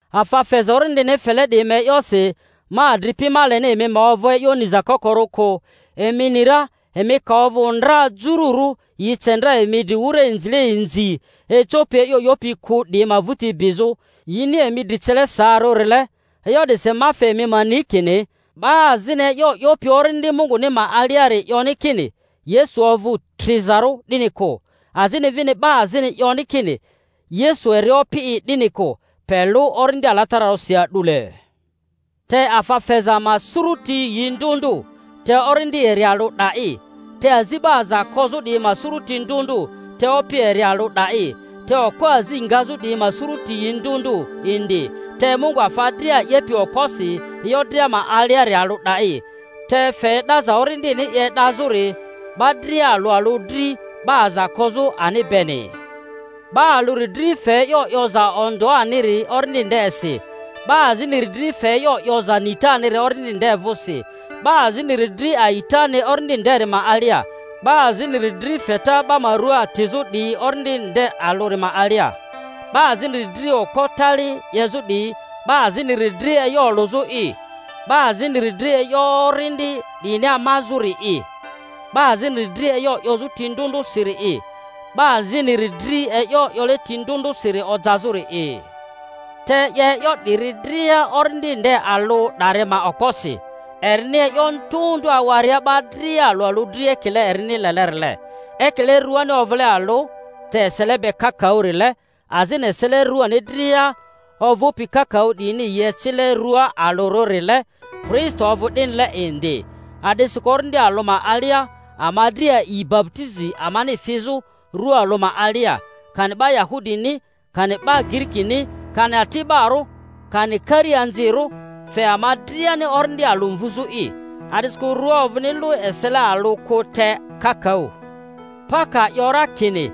Afa feza Orindini fele 'diyi ma e'yosi, ma adripi, ma leni emi ma ovᴜ e'yo niza kokorᴜ kᴜ. Emi ni ra, emi ka ovᴜ ndra jururᴜ, yi ce ndra emi dri wura inzile inzi ecopi e'yo 'yopi kᴜ 'diyi ma vᴜti bizᴜ, yini emi dri cele saarᴜrile. E'yo 'disi ma fe emi ma ni kini, 'ba azini e'yo 'yopi Orindi Munguni ma aliari 'yoni kini, Yesu ovᴜ trizarᴜ, 'dini kᴜ, azini vini 'ba azini 'yoni kini, Yesu eri Opi'i, 'dini kᴜ, pe lᴜ Orindi Alatararᴜrisi a'dule. Te afa feza ma suruti yi ndᴜ ndᴜ, te Orindi eri alᴜ 'da'i; te azi 'ba aza kozᴜ 'diyi ma sururi ndᴜ ndᴜ, te Opi eri alᴜ 'da'i; te okpo azi ngazᴜ 'diyi ma suruti yi ndᴜ ndᴜ indi, te Mungu afa dria 'yepi okposi e'yo dria ma aliari alᴜ 'da'i. Te fe e'daza Orindini i e'dazᴜri 'ba dria alᴜ alᴜ dri, 'ba aza kozᴜ ani beni. 'Ba alᴜri dri fe e'yo 'yoza ondᴜaniri Orindi ndesi, 'ba aziniri dri fe e'yo 'yoza nitaniri Orindi nde vᴜsi, 'ba aziniri dri a'itani Orindi nderi ma alia, 'ba aziniri dri feta 'ba ma rua atizᴜ 'diyi Orindi nde alᴜri ma alia, 'ba aziniri dri okpo tali 'yezᴜ 'diyi, 'ba aziniri dri e'yo olᴜzᴜ'i, 'ba aziniri dri e'yo orindi 'diyini amazᴜ-ri'i, 'ba aziniri dri e'yo 'yozᴜ ti ndᴜ ndᴜrᴜsiri'i, 'ba aziniri dri e'yo 'yole ti ndᴜ ndᴜsiri ojazᴜri'i. Te 'ye e'yo 'diyi dria Orindi nde alᴜ 'dari ma okposi, erini e'yo ndᴜ ndᴜ awaria 'ba dria alᴜ alᴜ dri ekile erini lelerile. Ekile ruani ovᴜle alᴜ, te esele be kakaᴜrile, azini esele ruani dria ovᴜpi kakaᴜ 'diyini yi ecile rᴜa alᴜrᴜrile, Kristo ovᴜ 'dinile indi. A'disikᴜ Orindi alᴜ ma alia ama dria a'i baputizi amani fizᴜ rua alᴜ ma alia, kani 'ba Yahudini kani 'ba Girikini, kani ati'barᴜ kani kari-anzirᴜ, fe ama driani Orindi alᴜ mvᴜzᴜ'i. A'disikᴜ rᴜa ovᴜni lᴜ esele alᴜ kᴜ, te kakaᴜ. Pa ka 'yo ra kini,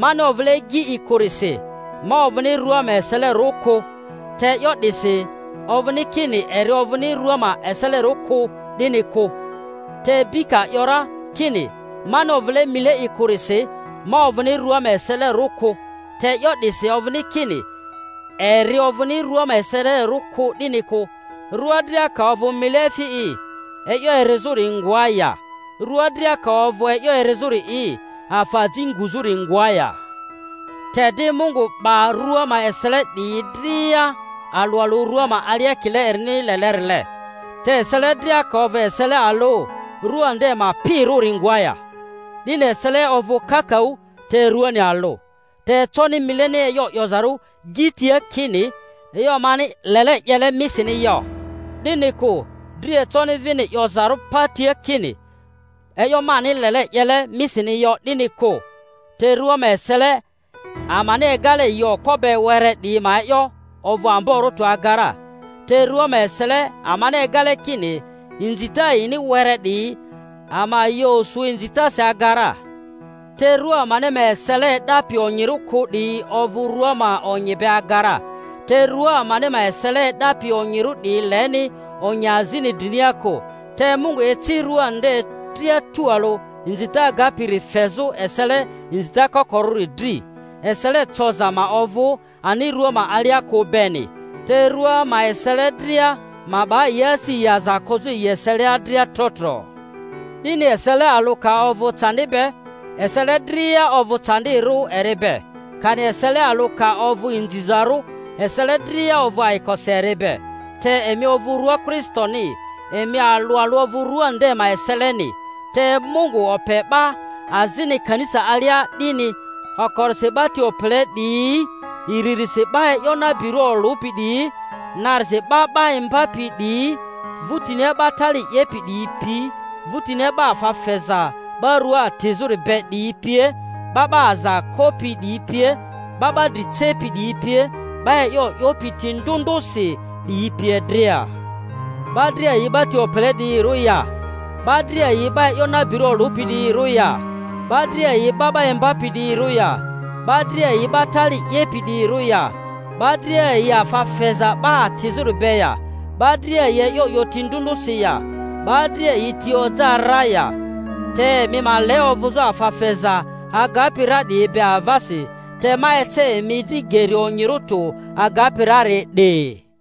Mani ovᴜle gi'i kᴜrisi, ma ovᴜni rua ma eselerᴜ kᴜ; te e'yo 'disi ovᴜni kini eri ovᴜni rᴜa ma eselerᴜ kᴜ, 'dini kᴜ. Te bi ka 'yo ra kini, Mani ovᴜle mile'i kᴜrisi ma ovᴜni rᴜa ma eselerᴜ kᴜ; te e'yo 'disi ovᴜni kini eri ovᴜni rᴜa ma eselerᴜ kᴜ, 'dini kᴜ. Rua dria ka ovᴜ mile efi'i, e'yo erizᴜri ngoa ya? Rua dria ka ovᴜ e'yo erizᴜri'i, afa aji nguzᴜri ngoa ya? Te di Mungu 'ba rua ma esele 'diyi dria alᴜ alᴜ rua ma alia ekile erini lelerile. Te esele dria ka ovᴜ esele alᴜ, rua nde ma pirᴜri ngoa ya? 'Dini esele ovᴜ kakaᴜ, te ruani alᴜ. Te econi mileni e'yo 'yozarᴜ gi tia kini, E'yo mani lele 'yele misini yo, 'dini kᴜ; dri econi vini 'yozarᴜ pa tia kini, E'yo mani lele 'yele emisini yo, 'dini kᴜ. Te rua ma esele amani egale yi okpo be were 'diyi ma e'yo ovᴜ amborᴜ tᴜ aga ra, te rᴜa ma esele amani egale kini inzita yini were 'diyi, ama yi osu inzitasi aga ra, te rua amani ma esele e'dapi onyirᴜ kᴜ 'diyi ovᴜ rᴜa ma onyi be aga ra, te rᴜa amani ma esele e'dapi onyirᴜ 'diyi leni onyi azini drinia kᴜ. Te Mungu eci rᴜa nde dria tualᴜ, inzita agapiri fezᴜ esele inzita kokorᴜri dri, esele coza ma ovᴜ ani rua ma alia kᴜ beni, te rua ma esele dria ma 'ba yi asi yi aza kozᴜ yi eselia dria tro tro. 'Dini esele alᴜ ka ovᴜ candi be, esele dria ovᴜ candirᴜ eri be; kani esele alᴜ ka ovᴜ inzizarᴜ, esele dria ovᴜ ayikosi eri be. Te emi ovᴜ rua Kristoni, emi alᴜ alᴜ ovᴜ rua nde ma eseleni. Te Mungu ope 'ba azini kanisa alia 'dini, okorisi 'ba ti opele 'diyi, iririsi 'ba e'yo nabirᴜ olᴜpi 'diyi, narisi 'ba 'ba imbapi 'diyi, vᴜtinia 'ba tali 'yepi 'diyi pi, vᴜtinia 'ba afa feza 'ba rua atizᴜri be 'diyi pie, 'ba 'ba aza kopi 'diyi pie, 'ba 'ba dri cepi 'diyi pie, 'ba e'yo 'yopi ti ndᴜ ndᴜsi 'diyi pie dria. 'Ba dria yi 'ba ti opele 'diyirᴜ ya? 'Ba dria yi 'ba e'yo nabirᴜ olᴜpi 'diyirᴜ ya? 'Ba dria yi 'ba 'ba imbapi 'diyirᴜ ya? 'Ba dria yi 'ba tali 'yepi 'diyirᴜ ya? 'Ba dria yi afa feza 'ba atizᴜri be ya? 'Ba dria yi e'yo 'yo ti ndᴜ ndᴜsi ya? 'Ba dria yi ti oja ra ya? Te emi ma le ovᴜzᴜ afa feza agapi ra 'diyi be avasi. Te ma ece emi dri geri onyirᴜ tᴜ agapi rari 'di.